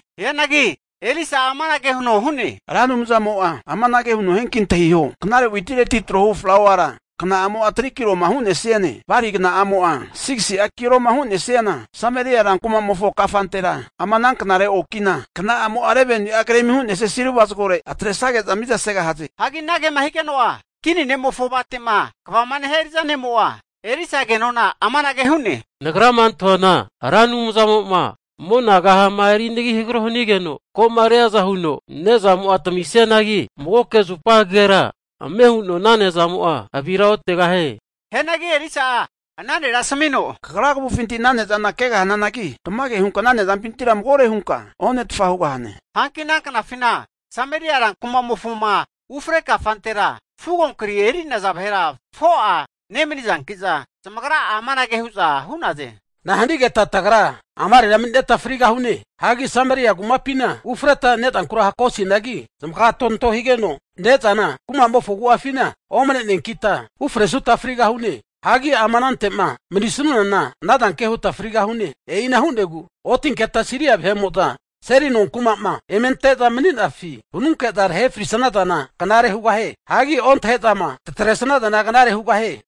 Hianagi Elisa'a amanage huno hu'ne, Ra Anumzamo'a amanage huno hianki antahio, knare witireti trohu flauara, kna'amo'a 3'a kiloma hu'nesiane, balia kna'amo'a 6si'a kiloma hu'nesiana Sameria rankumamofo kafantera, ama ana knare okina kna'amo'a 11ni'a gremi hu'nesia silva zagore atresage'za mizasegahaze. Hagi anagema higeno'a, kini ne'mofo avate'ma kva nehia eri'za ne'mo'a, Elisa ke nona'a amanage hu'ne, Nagrama antahuana Ra Anumzamo'ma mona kahama erinagi hagaro hanigeno, ko'ma riaza huno nezamo'a tamisnianagi magoke zupagera ame huno ana ne'zamo'a aviraotegahie. Hianagi Elisa'a ana nera asmino, kagra kavufinti ana ne'zana kegahananagi, tamage hunka ana nezampintira magore hunka onetfa hugahane. Hanki ana knafina, Sameria rankumamofoma ufre kafantera fugo kri eri'naza vahera 4'a nemani'zanki'za, zamagra'a amanage hu'za hu'naze, Nahanigeta tagra amarera mani'neta frigahune? Hagi Sameria kumapina ufreta ne'zankura hakosinagi, zamaga tonto higeno ne'zana kumamofo agu'afina omne'neankita ufresuta ufrigahune. Hagi ama anante'ma manisunana ana zanke huta frigahune. E'ina hu'negu otinketa Siria vahe'mo'zama seli nonkuma'ma eme ante'za mani'nafi vanunke'zama tahe frisazana knare hugahie. Hagi ontahe'zama tatresazana knare hugahie.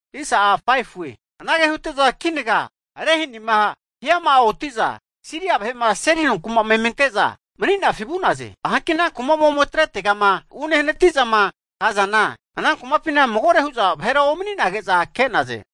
Anage hute'za kinaga rehanima hiama'a oti'za, Siria vahe'ma seli nonkuma'ma eme ante'za mani'nafi vu'naze. Hanki ana kuma'ma ome atretegama unehanati'zama kazana, ana kumapina magore hu'za vahera omani'nage'za ke'naze.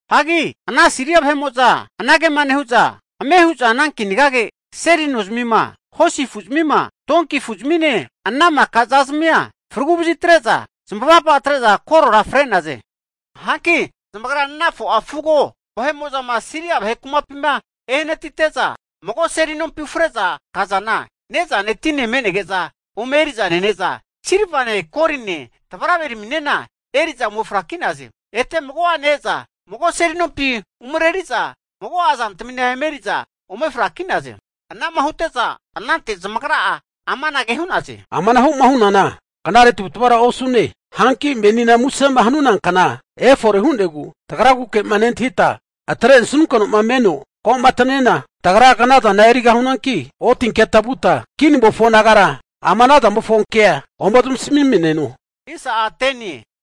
Hagi ana Siria vahe'mo'za anagema nehu'za, ame hu'za ana kinagage, seli nozamima, hosi afu'zamima, tonki afu'zamine, ana maka zazmia fragu vazitre'za zamavapa atre'za korora fre'naze. Hanki zamagra ana 4'a fugo namuma zamarenea vahe'mo'zama Siria vahe kumapima ehanatite'za, mago seli nompi ufre'za kazana, ne'zane tine me'nege'za ome eri'za nene'za, silvane, goline tavaraveraminena eri'za ome fraki'naze. Ete mago'ene e'za mago seli nompi umareri'za mago'a zantamina eme eri'za ome fraki'naze. Anama hute'za anante zamagra'a amanage hu'naze, Amanahu'ma hunana knare tavu'tavara osune. Hanki menina musema hanuna kna efore hu'negu, tagraguke'ma nentahita atre'nesunkeno'ma meno ko'mataniana, tagra knazana erigahunanki, otinketa vuta kinimofo nagara ama ana zamofonkea ome zamasamimneno.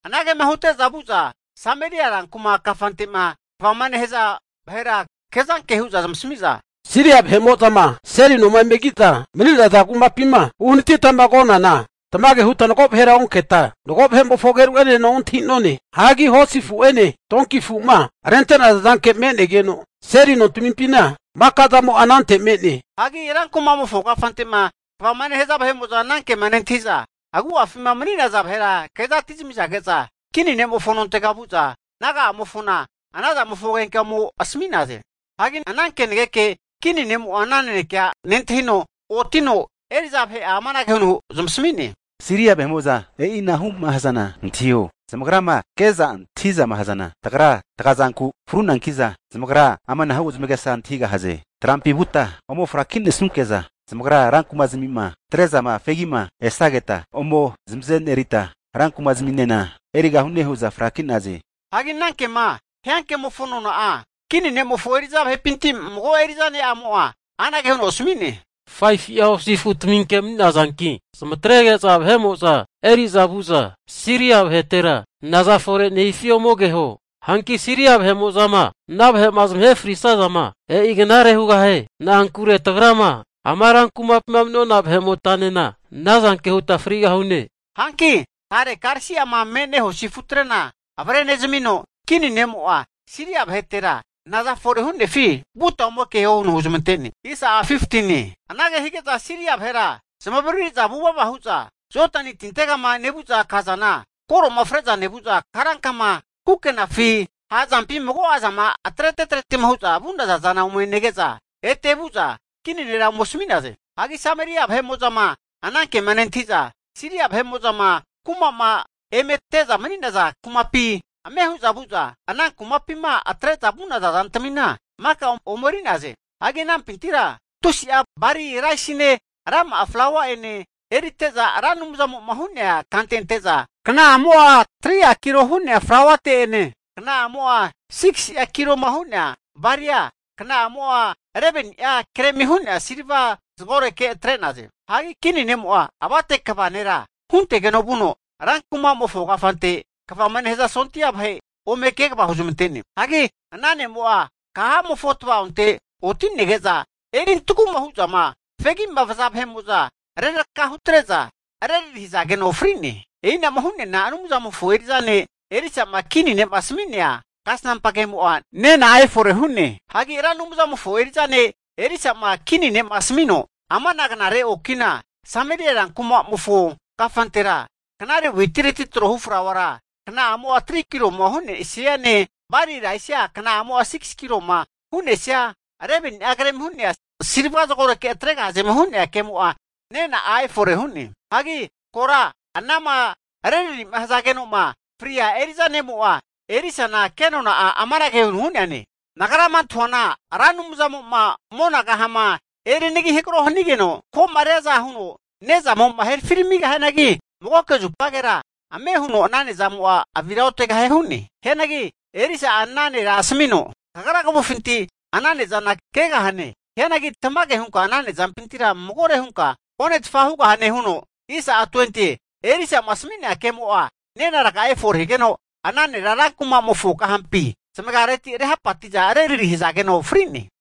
Anagema hute'za vu'za Sameria rankuma kafante'ma kvama nehaza vahera kezanke hu'za zamasmi'za, Siria vahe'mo'zama seli noma eme ki'za mani'naza kumapima uhanatitama konana, tamage huta mago vahera onketa, mago vahe'mofo ageru'enena ontahi'none. Hagi hosi afu'ene, tonki afu'ma rente'naza zanke megeno, seli nontamimpina maka zamo'a anante me'ne Hagi rankumamofo kafante'ma kvama nehaza vahe'mo'za anankema nentahi'za, agu'afima mani'naza vahera kezati'za zamasamizage'za, kini ne'mofo nontega vu'za naga'amofona anazamofo agenkea ome asami'naze. Hagi ana kenageke kini ne'mo'a ana nanekea nentahino, oti'no eri'za vahe'a amanage huno zamasami'ne, Siria vahe'mo'za e'inahu'ma hazana antahiho, zamagrama ke'za antahi'zama hazana tagra tagazanku frunanki'za, zamagra amanahu zamagesa antahigahaze, trampi vuta ome frakinesunke'za zamagra rankuma'zamima atre'zama fegi'ma esageta, ome zamazenerita, rankumazaminena erigahune hu'za fraki'naze. Hagi ana kema hia kemofo nona'a, kini ne'mofo eri'za vahepinti mago eri'za ne'amo'a anage huno asmi'ne, 5fu'a hosi afutaminke mani'nazanki zamatrege'za eri'za vu'za Siria vahetera naza fore hu'nefi ome keho. Hanki Siria vahe'mo'zama ana vahe'ma zamahe frisazana, e'i knare hugahie. Na'ankure tagrama ama rankumapima mani'nona vahe'motanena, anazanke huta frigahune. Hanki tare karisi'ma me'ne hosi afutrena avrenezamino, kini ne'mo'a Siria vahetera naza fore hu'nefi vuta ome keho huno huzmante'ne. Anage hige'za Siria vahera zamavariri'za vuvava hu'za Jodani tintegama nevu'za kazana, koro'ma fre'za nevu'za, karankama kukenafi, ha'zampi mago'azama atrete atretema hu'za vu'naza zana ome nege'za, ete vu'za kini nera ome asmi'naze. Hagi Sameria vahe'mo'zama ana kema nentahi'za, Siria vahe'mo'zama kuma'ma eme ante'za mani'naza kumapi ame hu'za vu'za, ana kumapima atre'za vu'naza zantamina maka ome eri'naze. Hagi anampintira tusi'a bali raisine, rama'a flaua'ene erite'za, Ra Anumzamo'ma hu'nea kante ante'za, kna'amo'a 3'a kilo hu'nea flauate'ene, kna'amo'a 6si'a kiloma hu'nea balia, kna'amo'a 11ni'a gremi hu'nea silva zagoreke atre'naze. Hagi kini ne'mo'a avate kva nera huntegeno vuno, rankumamofo kafante'ma kvama nehaza sondia vahe' ome kegava huzmante'ne. Hagi ana ne'mo'a kahamofo tava'onte oti'nege'za, erintagu hu'zama fegi'ma vaza vahe'mo'za reraraka hutre'za rerari hazageno fri'ne. E'inama hu'neana Anumzamofo eri'za ne' Elisa'ma kini ne'ma asami'nea kasnampa kemo'a nena'a efore hu'ne. Hagi Ra Anumzamofo eri'za ne' Elisa'ma kini ne'ma asmino, amana knare oki'na, Sameria rankuma'mofo kafantera, knare witireti trohu flauara, kna'amo'a 3'a kiloma hu'nesiane, bali raisia kna'amo'a 6si'a kiloma hu'nesiana 11ni'a gremi hu'nea silva zagoreke atregahazema hu'nea ke'mo'a, nena'a efore hu'ne. Hagi kora anama rerari'ma hazageno'ma fria eri'za ne'mo'a, Elisana kenona'a amanage hu'neane, Nagrama antahuana Ra Anumzamo'ma mona kahama erinagi hagro hanigeno, ko'ma riaza huno ne'zamo'a herafiramigahianagi magoke zupagera ame huno ana ne'zamo'a avira otegahie hu'ne. Hianagi Elisa'a ana nera asmino, kagra kavufinti ana ne'zana kegahane. Hianagi tamage hunka ana ne'zampintira magore hunka onetfa hugahane huno, Elisa'ma asmi'nea kemo'a nena'a efore higeno, ana nera ran kuma'mofo kahampi zamagareti rehapati'za rerari hazageno fri'ne.